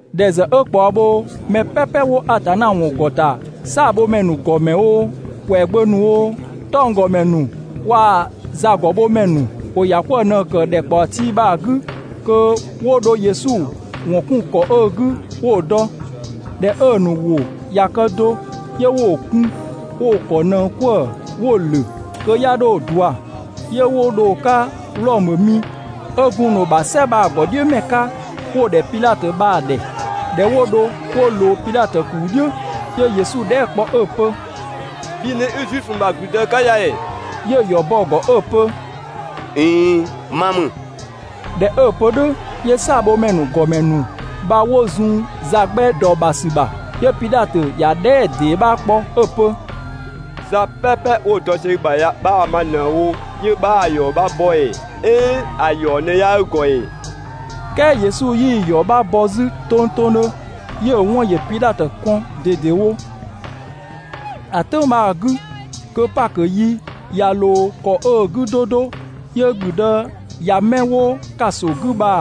‑Dhɛ ‑zë 'ö ꞊kpaɔ bhoo, mɛ "pɛpɛ 'wo Atanna ‑wɔn ‑gɔ ‑ta, "saabhomɛ ‑nu ‑gɔmɛ oo, ‑kwɛagbö ‑nu oo, 'tɔnggɔmɛ ‑nu waa‑ zagɔbhomɛ ‑nu ‑wo ‑ya 'kwëë‑ ꞊në‑ ‑kë ‑dhɛkpaɔ tii bha‑ 'gü kö 'wo dho Yesu ‑wɔn 'kun ‑kɔ 'ö‑ 'gü 'wo‑ dɔ. ꞊Dhɛ 'ö‑ ‑nu ‑wʋ ꞊ya kë do, 'yö 'wo‑ kun 'wo‑ ‑kɔ ꞊nëng 'kwëë‑ 'wo‑ ‑lö, (kö 'ya 'dho ꞊dua) 'yö 'wo dho‑ 'ka Wlɔmö mi 'ö gun‑ ‑nu ‑bha "sɛ bha‑ ‑gɔdhiʋ̈mɛ 'ka 'wo‑ ‑dhɛ Pidhatö bha‑ ‑dhɛ. ꞊Dhɛ 'wo dho 'wo ꞊loo Pidhatö ‑kuu "dhiʋ̈, 'yö Yesu dhɛɛ" kpɔ 'ö‑ pö: «Bhi ꞊në 'i Zuifö ‑nu ‑bha ‑gblüdë 'ka ya ‑ee?» 'Yö‑ ‑yɔ bɔ‑ ‑gɔ 'ö‑ pö: «꞊Iin, ma ‑mü.» ꞊Dhɛ 'ö‑ pö "dhʋ̈, 'yö "saabhomɛ ‑nu ‑gɔmɛ ‑nu bha 'wo zun za 'gbɛ ‑dɔ ‑bha ‑sü ‑bha. 'Yö Pidhatö ‑ya dhɛɛ" ‑dee 'bha kpɔ 'ö‑ pö: «Za "pɛpɛ 'wo‑ dɔ sië i ‑bha ya 'bhaa‑ ma ꞊në‑ wo 'yö 'bhaa‑ ‑yɔ 'bha bɔ ‑ee? "Ɛɛn ‑a ‑yɔ ꞊në 'yaa i ‑gɔ ‑ee?» "Kɛɛ Yesu 'yii‑ ‑yɔ 'bha bɔ 'zü tongtongdhö, 'yö‑ 'wɔn ‑yö Pidhatö kɔn ꞊dedewo. ‑A "tʋ̈ng bha‑ 'gü, kö Pakö yi ꞊ya ꞊loo ‑kɔ 'ö‑ 'gü 'do 'do, 'yö ‑gblüdë ꞊ya 'mɛ 'wo ‑kaso 'gü bha‑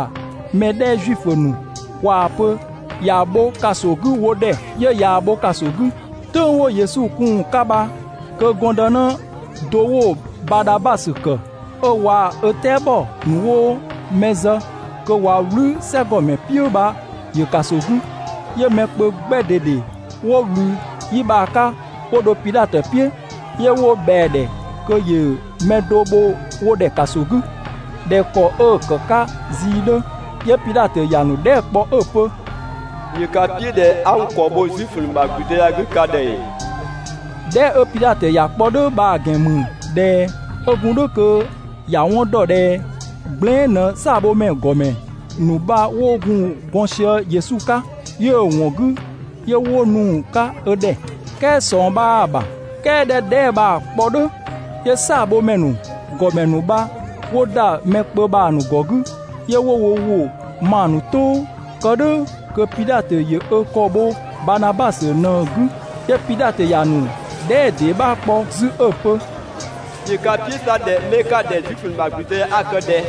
mɛ 'dhɛ Zuifö ‑nu ꞊waa‑ pö ‑ya bho ‑kaso 'gü wo ‑dhɛ, 'yö ꞊yaa‑ bho ‑kaso 'gü. "Tʋ̈ng 'wo Yesu kun‑ 'ka bha kö gɔndënë do 'wo Badhabasö ‑kë, 'ö waa‑ ö "tɛabɔ ‑nu 'wo mɛ zë kö ꞊wa "wlü "sɛgɔmɛ "piʋ̈ bha ‑yö ‑kaso 'gü. 'Yö mɛ kpö 'gbɛ ꞊dede 'wo ꞊wlü 'yi bha‑ 'ka 'wo dho Pidhatö "piʋ̈, 'yö 'wo ꞊bhɛa‑ ‑dhɛ kö ‑yö mɛ do bho wo ‑dhɛ ‑kaso 'gü ꞊dhɛ ‑kɔ 'ö‑ ‑kë 'ka zii‑ 'dhö. 'Yö Pidhatö ‑ya ‑nu dhɛɛ" kpɔ 'ö‑ pö: «‑Yö ka "piʋ̈ ꞊dhɛ 'a n ‑kɔ bho Zuifö ‑nu ‑bha ‑gblüdë ya‑ 'gü ka ‑dhɛ ‑ee?» Dhɛɛ" 'ö Pidhatö ‑ya kpɔ "dhʋ̈ bha‑ ‑gɛn ‑mü ꞊dhɛ 'ö gun "dhʋ̈ kö ‑ya 'wɔn dɔ ꞊dhɛ gblɛɛn" ꞊në "saabhomɛ ‑gɔmɛ ‑nu bha 'wo gun gɔn sië Yesu 'ka, 'yö‑ ‑wɔn 'gü 'yö 'wo nu‑ 'ka ö ‑dhɛ, "kɛɛ ꞊sɔng 'bhaa‑ ‑bha. "Kɛɛ ꞊dhɛ 'ö dhɛɛ" bha‑ kpɔ "dhʋ̈, 'yö "saabhomɛ ‑nu ‑gɔmɛ ‑nu bha 'wo ‑da mɛ kpö bha‑ ‑nu ‑gɔ 'gü, 'yö 'wo ‑wʋ ma‑ ‑nu "tʋʋ, kë "dhʋ̈ kö Pidhatö ‑yö ö ‑kɔ bho Badhabasö ꞊në‑ 'gü. 'Yö Pidhatö ‑ya ‑nu dhɛɛ" ‑dee 'bha kpɔ 'zü 'ö‑ pö: «‑Yö ka "piʋ̈ 'sa ꞊dhɛ 'mɛ 'ka‑ ‑dhɛ Zuifö ‑nu ‑bha ‑gblüdë ya 'a‑ kë ꞊dhɛ?»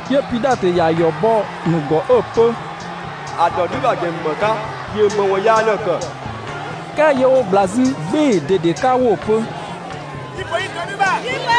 'Yö Pidhatö ‑ya ‑yɔ bɔ‑ ‑nu ‑gɔ 'ö‑ pö: «‑A ‑dɔ "dhü ‑bha ‑gɛn ‑mü ‑më 'ka? ‑Yö ‑më ‑wɔn yaa ꞊në‑ ‑kë?» "Kɛɛ 'yö 'wo ꞊gbla 'zü "gbɩɩ‑ ꞊dede 'ka 'wo‑ pö: «Yi‑ ‑pö 'i dɔ "dhü ‑bha!»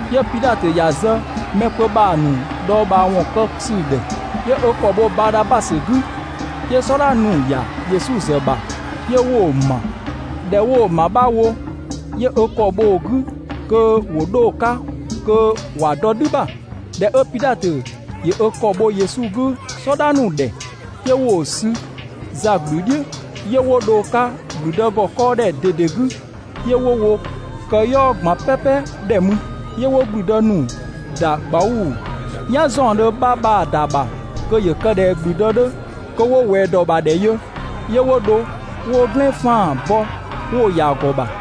'Yö Pidhatö ‑ya zë mɛ kpö bha‑ ‑nu dhɔɔbhaawɔn kë ‑sü ‑dhɛ, 'yö ö ‑kɔ bho Badhabasö 'gü. 'Yö "sɔdha ‑nu ‑ya Yesu ‑zë ‑bha 'yö 'wo‑ ‑ma. ꞊Dhɛ 'wo‑ ‑ma 'bha wo, 'yö ö ‑kɔ bho‑ 'gü kö ‑wo 'dho‑ 'ka kö ‑wa dɔ "dhü ‑bha. ꞊Dhɛ 'ö Pidhatö ‑yö ö ‑kɔ bho Yesu 'gü "sɔdha ‑nu ‑dhɛ, 'yö 'wo‑ sü za ꞊gblü "dhiʋ̈ 'yö 'wo dho‑ 'ka ‑gblüdë ‑gɔ 'kɔɔdhɛ ꞊dede 'gü, 'yö 'wo wo këyɔɔ ꞊gban "pɛpɛ ‑dhɛ mü. 'Yö 'wo ‑gblüdë ‑nu ‑da ꞊gbauu‑ "yan ‑zaɔndhö 'bha bha‑ ‑da ‑bha kö ‑yö kë ꞊dhɛ ‑gblüdë 'dhö, kö 'wo ꞊wɛɛ ‑dɔ ‑bha ‑dhɛ yö, 'yö 'wo dho 'wo "glɛn 'faan‑ bɔ 'wo‑ ‑ya ‑gɔ ‑bha,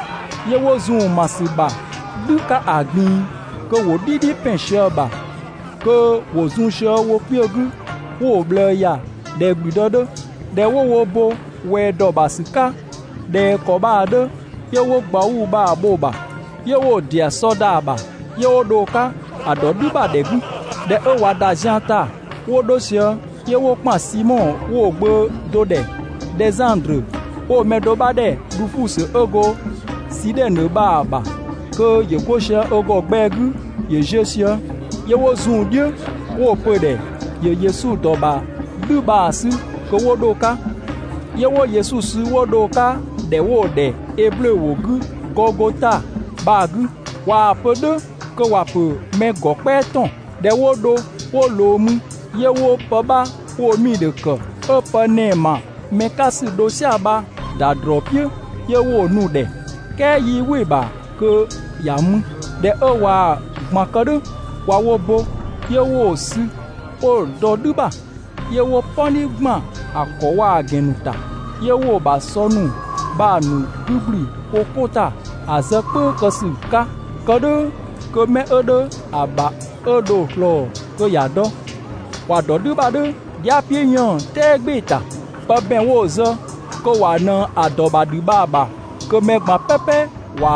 'Yö 'wo zun‑ ‑ma ‑sü ‑bha "dhü 'ka ‑a ꞊gbin‑, kö ‑wo "dhidhi ‑pɛn sië‑ ‑bha, kö ‑wo zun sië wo kpiö 'gü, 'wo‑ ꞊bhlëë ‑ya ꞊dhɛ ‑gblüdë 'dhö. ꞊Dhɛ 'wo wo bo ꞊wɛɛ ‑dɔ ‑bha ‑sü 'ka ꞊dhɛ ‑kɔ bha‑ 'dhö, 'yö 'wo ꞊gbauu‑ bha‑ bho‑ ‑bha, 'yö 'wo‑ ‑dɩ ‑a sɔ ‑da ‑bha, 'yö 'wo dho‑ 'ka ‑a ‑dɔ "dhü ‑bha ‑dhɛ 'gü. ꞊Dhɛ 'ö ꞊wa ‑da zian ‑ta 'wo 'dho sië, 'yö 'wo ‑kpan Simɔ 'wo‑ gbö do ‑dhɛ Dhɛzandrö, 'wo‑ mɛ do 'bha ‑dhɛ Dhufusö 'ö go Sidhɛnö bha‑ ‑bha kö ‑yö 'go sië ö ‑gɔ gbɛɛ 'gü ‑yö ziö sië. 'Yö 'wo zun‑ "dhiʋ̈ 'wo‑ pö‑ ‑dhɛ ‑yö Yesu ‑dɔ ‑bha "dhü bha‑ 'sü kö 'wo 'dho‑ 'ka. 'Yö 'wo Yesu sü 'wo dho‑ 'ka ‑dhɛ 'wo‑ ‑dhɛ eblö ‑wʋ 'gü Gɔgota bha‑ 'gü (꞊waa‑ pö "dhʋ̈ kö ‑wa ‑pö ‹mɛ ‑gɔ "kpɛa ‑tɔn›.) ꞊Dhɛ 'wo dho 'wo ꞊loo mü, 'yö 'wo pë 'bha 'wo‑ 'miidhö ‑kë, 'ö pë ‑nɛɛ ‑ma mɛ 'ka ‑sü dho "sia‑ bha‑ ‑da ‑drɔɔ "piʋ̈ 'yö 'wo‑ nu‑ ‑dhɛ, "kɛɛ 'yii "wɩ‑ ‑bha kö ‑ya mü. ꞊Dhɛ 'ö ꞊waa‑ ꞊gban kë "dhʋ̈ ꞊wa wo bo, 'yö 'wo‑ sü 'wo‑ dɔ "dhü ‑bha, 'yö 'wo "pɔni ‑gban ‑a ‑kɔ waa‑ ‑gɛn ‑nu ‑ta. 'Yö 'wo‑ ‑bha ‑sɔ ‑nu bha‑ ‑nu 'gü ‑gblü wo 'ko ‑ta ‑a zë "kpʋ̈ü kë ‑sü 'ka, kë "dhʋ̈ kö mɛ 'ö 'dhö ‑a ‑bha 'ö dho‑ ꞊slɔɔ kö ‑ya dɔ. ‑Wa ‑dɔ "dhü ‑bha "dhʋ̈ dhia" "piʋ̈ 'yënng‑ "tɛɛ "gbɩɩ‑ ‑ta. Pë ‑bɛn 'wo‑ zë kö ꞊wa ꞊nëng ‑a ‑dɔ ‑bha ‑dhü bha‑ ‑bha kö mɛ ꞊gban "pɛpɛ ‑wa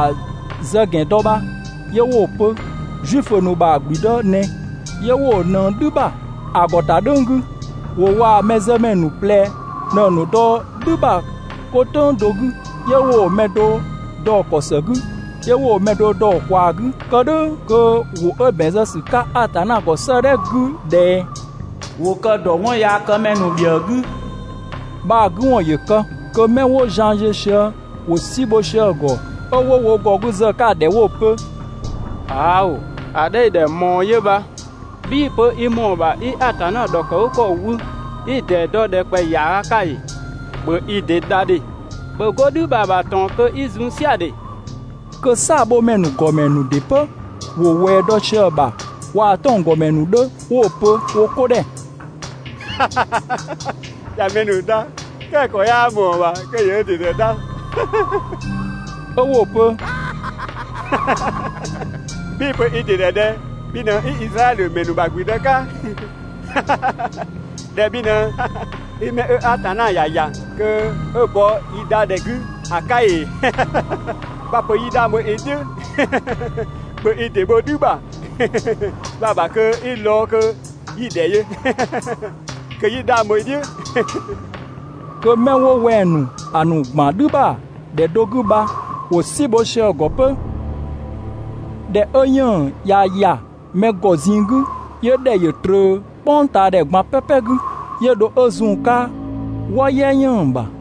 zë ‑gɛn dɔ bha, 'yö 'wo‑ pö: «Zuifö ‑nu ‑bha ‑gblüdë ꞊nɛ». 'Yö 'wo‑ ꞊nëng "dhü ‑bha ‑a ‑gɔ ‑ta "dhʋ̈ng 'gü. ‑Wo waa‑ mɛzëmɛ ‑nu ꞊plɛ ꞊në‑ ‑nu dɔ "dhü ‑bha 'ko "tʋ̈ng do 'gü. 'Yö 'wo‑ mɛ do dɔ‑ ‑kɔ ‑së 'gü, 'yö 'wo mɛ do dɔ‑ ꞊kwaa 'gü. [Kë "dhʋ̈ kö ‑wʋ 'ö ‑bɛn zë ‑sü 'ka Atanna ‑gɔ 'sëëdhɛ 'gü ꞊dhɛ: «‑Wo kë‑ ‑dɔ 'wɔnyaakëmɛ ‑nu ‑bhiëë 'gü» bha‑ 'gü ‑wɔn ‑yö kë.] 'Kö 'mɛ 'wo zian ziö sië ‑wo "si bho sië‑ ‑gɔ 'ö 'wo wo ‑gɔ 'gü zë‑ 'ka‑ ‑dhɛ 'wo‑ pö: «‑Aao! ‑A 'dhɛ 'i‑ ‑dhɛ ꞊mɔɔ 'yö bha! 'Bhii‑ pö i ‑mɔɔ ‑bha 'i Atanna ‑dhɔkëgükɔ wü, 'i‑ ‑dee dɔ ‑dhɛkpaɔyi ‑yaaga 'ka ‑ee? ‑Bhö i ‑dɩ dha ‑dhe! ‑Bhö 'go "dhü bha‑ ‑bha ꞊tɔn kö 'i zun "sia‑ ‑dhe!» Kö "saabhomɛ ‑nu ‑gɔmɛ ‑nu ‑dɩ 'pö ‑wo ꞊wɛɛ dɔ sië‑ ‑bha waa‑ 'tɔnggɔmɛ ‑nu 'dhö, 'wo‑ pö wo 'ko ‑dhɛ: «꞊Ya mɛ ‑nu dha, "kɛɛ ‑a ‑kɔ 'yaa ꞊mɔɔ‑ ‑bha kö ‑yö ö ‑dɩ ‑zë dha!» 'Ö 'wo‑ pö: «'Bhii‑ pö i ‑dɩ ‑dhɛ ꞊dhɛ bhi ꞊në 'i Izraɛdhö ‑mɛ ‑nu ‑bha ‑gblüdë 'ka, ꞊dhɛ bhi ꞊në 'i 'mɛ 'ö Atanna ‑ya ‑ya kö 'ö‑ bɔ yi dha ‑dhɛ 'gü ‑a 'ka ‑ee? 'Bha‑ pö 'yi 'dhang bho i "dhiʋ̈, ‑bhö i ‑dɩ bho "dhü bha‑ ‑bha kö 'i lɔɔ‑ kö 'yi‑ ‑dhɛ yö kö 'yi 'dhang bho i "dhiʋ̈!» Kö 'mɛ 'wo wɛng‑ ‑nu ‑a ‑nu ‑gban "dhü ‑bha ‑dhɛ do 'gü bha, ‑wo "si bho sië‑ ‑gɔ 'pö. ꞊Dhɛ 'ö 'yënng‑ ꞊ya ‑ya mɛ ‑gɔ ꞊zinng 'gü, 'yö ‑dhɛ ‑yö ꞊tröö "kpʋngtaadhɛ ꞊gban "pɛpɛ 'gü, 'yö dho 'ö zun‑ 'ka "wɔ "yɛ ‑yën ‑bha.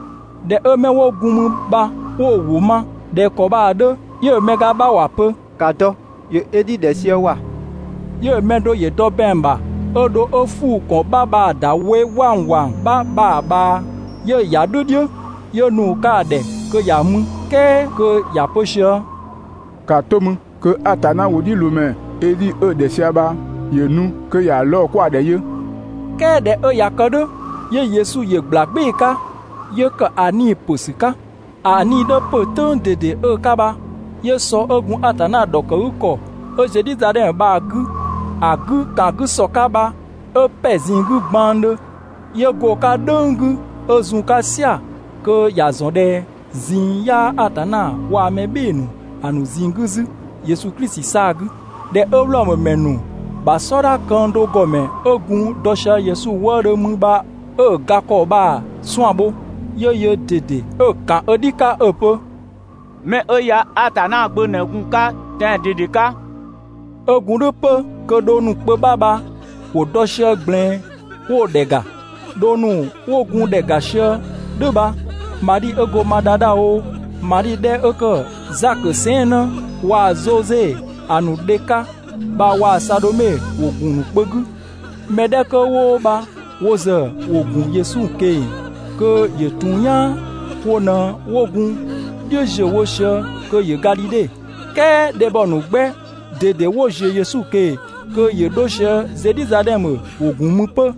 ꞊Dhɛ 'ö 'mɛ 'wo gun mü bha 'wo‑ ‑wʋ ma ꞊dhɛ ‑kɔ bha‑ 'dhö, 'yö‑ mɛ ga 'bha ‑wa pö: «‑Ka dɔ! ‑Yö Edhi ‑dhɛ sië ‑wa!» 'Yö‑ mɛ do ‑yö dɔ ‑bɛang ‑bha 'ö dho 'ö ‑fuu ‑kɔn 'bha bha‑ ‑da we 'wangwang 'bha bha‑ ꞊bhaa, 'yö‑ ‑ya "dhü "dhiʋ̈, 'yö nu‑ 'ka‑ ‑dhɛ kö ‑ya mü, "kɛɛ kö ‑ya pö sië: «‑Kaa 'to mü kö (Atanna ‑wʋdhiʋ̈loomɛ) Edhi 'ö‑ ‑dhɛ sië bha ‑yö nu kö ‑ya lɔɔ 'kwa‑ ‑dhɛ yö!» "Kɛɛ ꞊dhɛ 'ö ꞊ya kë "dhʋ̈, 'yö Yesu ‑yö ꞊gbla "gbɩɩ‑ 'ka, 'yö ‑kë ‑a 'nii‑ ‑pö ‑sü 'ka. ‑A 'nii‑ 'dhö ‑pö "tʋ̈ng ꞊dede 'ö‑ 'ka bha, 'yö sɔ 'ö gun Atanna ‑dhɔkëgükɔ 'ö Zedhizadhɛmö bha‑ 'gü, ‑a 'gü ‑kan 'gü ‑sɔ 'ka bha 'ö ‑pɛ ꞊zinng 'gü gbanngdhö, 'yö go‑ 'ka "dhʋ̈ng 'gü 'ö zun‑ 'ka "sia‑ (kö ‑ya ‑zɔn ꞊dhɛ ꞊zinng 'yaa Atanna waa‑ mɛ "bhɩɩ‑ ‑nu ‑a ‑nu ꞊zinng 'gü 'zü Yesu Klisi 'saa‑ 'gü). ꞊Dhɛ 'ö Wlɔmö ‑mɛ ‑nu ‑bha "sɔdha këng do ‑gɔmɛ 'ö gun dɔ sië Yesu wëëdhö mü bha 'ö‑ ga ‑kɔ bha‑ 'suan‑ bho, 'yö yöö ꞊dede 'ö‑ ‑kan ö "dhi 'ka 'ö‑ pö: «'Mɛ 'ö ya Atanna Gbö ꞊në gun‑ 'ka tɛan‑ ꞊dede 'ka!» 'Ö gun "dhʋ̈ 'pö kö dhong ‑nu kpö 'bha bha ‑wo dɔ sië ꞊gblɛɛn 'wo‑ ‑dhɛ ‑ga. Dhong ‑nu 'wo gun ‑dhɛ ‑ga sië "dhʋ̈ bha, Madhi 'ö go Madadha oo, Madhi 'dhɛ 'ö ‑kë Zakö sɛɛnnë waa‑ Zoze ‑a ‑nu dhe 'ka bha waa‑ Sadhome ‑wo ‑gun ‑nu kpö 'gü. Mɛ 'dhɛ 'kö 'wo bha wo ‑zë ‑wo gun Yesu ꞊keng‑ kö ‑yö ‑tun "yaan, wo ꞊në 'wo gun‑ "dhiʋ̈ ‑ziö wo sië kö ‑yö Gadhidhe, "kɛɛ dhebhɔ ‑nu 'gbɛ ꞊dede 'wo ‑ziö Yesu ꞊keng‑ kö ‑yö 'dho sië Zedhizadhɛmö, ‑wo ‑gun mü 'pö.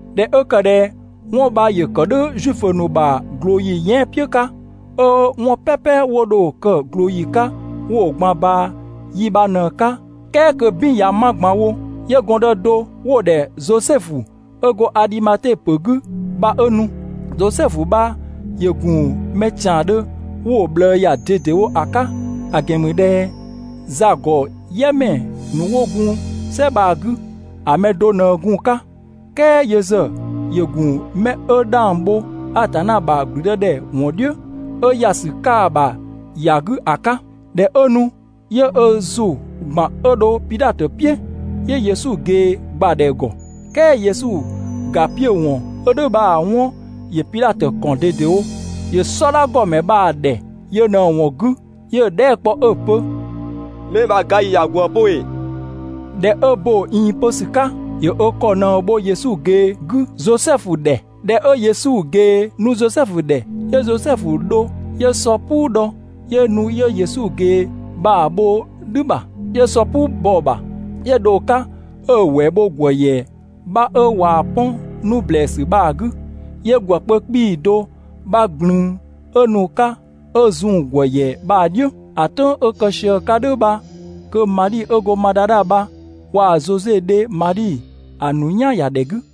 ꞊Dhɛ 'ö ‑kë ꞊dhɛ 'wɔn bha ‑yö ‑kë "dhʋ̈ Zuifö ‑nu ‑bha ꞊glooyi yɛan" "piʋ̈ 'ka, 'ö 'wɔn "pɛpɛ 'wo dho‑ kë ꞊glooyi 'ka 'wo‑ ꞊gban ꞊baa 'yi bha ꞊në‑ 'ka, "kɛɛ kö "bin ꞊ya 'ma ꞊gban wo, 'yö gɔndë do 'wo‑ ‑dhɛ Zosɛfu 'ö go Adhimate ‑pö 'gü bha 'ö nu. Zosɛfu bha ‑yö ‑gun mɛ ‑tiandhö 'wo‑ ꞊bhlëë ‑ya ꞊dedewo ‑a 'ka, ‑a ‑gɛn ‑mü ꞊dhɛ za ‑gɔ "yɛ ‑mɛ ‑nu 'wo gun "sɛ bha‑ 'gü ‑a mɛ do ꞊në gun‑ 'ka, "kɛɛ yö ‑zë ‑yö ‑gun 'mɛ 'ö 'dhang bho Atanna ‑bha ‑gblüdëdhɛ ‑wɔn "dhiʋ̈, 'ö ‑ya ‑sü 'ka‑ ‑bha ‑ya 'gü ‑a 'ka. ꞊Dhɛ 'ö nu, 'yö ö ‑zʋ ‑gban 'ö dho Pidhatö "piʋ̈, 'yö Yesu ꞊gee ‑gbadhɛ ‑gɔ. "Kɛɛ Yesu ‑ga 'piö‑ ‑wɔn 'ö "dhʋ̈ bha‑ 'wɔn ‑yö Pidhatö ‑kɔn ꞊dedewo. ‑Yö "sɔdha ‑gɔmɛ bha‑ ‑dhɛ yö ꞊në‑ ‑wɔn 'gü, 'yö‑ dhɛɛ" kpɔ 'ö‑ pö: «'Mɛ bha‑ ga ‑yi ꞊ya ꞊gwëë 'pö wo ‑ee?» ꞊Dhɛ 'ö bo‑ ꞊iin pö ‑sü 'ka, ‑yö ö ‑kɔ ꞊në bho Yesu ꞊gee 'gü Zosɛfu ‑dhɛ. ꞊Dhɛ 'ö Yesu ꞊gee nu Zosɛfu ‑dhɛ, 'yö Zosɛfu dho 'yö sɔ "puu dhɔ, 'yö nu 'yö Yesu ꞊gee bha‑ bho "dhü ‑bha, 'yö sɔ "puu bɔ‑ ‑bha, 'yö dho‑ 'ka 'ö‑ ‑wɛɛ bho ‑gwë ‑yɛ 'bha 'ö ꞊waa‑ 'pɔn 'nu ‑blɛɛsü bha‑ 'gü, 'yö ‑gwë kpö 'kpii‑ do 'bha ꞊glün 'ö nu‑ 'ka 'ö‑ zun ‑gwë ‑yɛ bha‑ "dhiʋ̈. ‑A "tʋ̈ng 'ö‑ kë sië‑ 'ka "dhʋ̈ bha kö Madhi 'ö go Madadha bha waa‑ Zoze dhe Madhi ‑a ‑nu "yan ‑ya ‑dhɛ 'gü.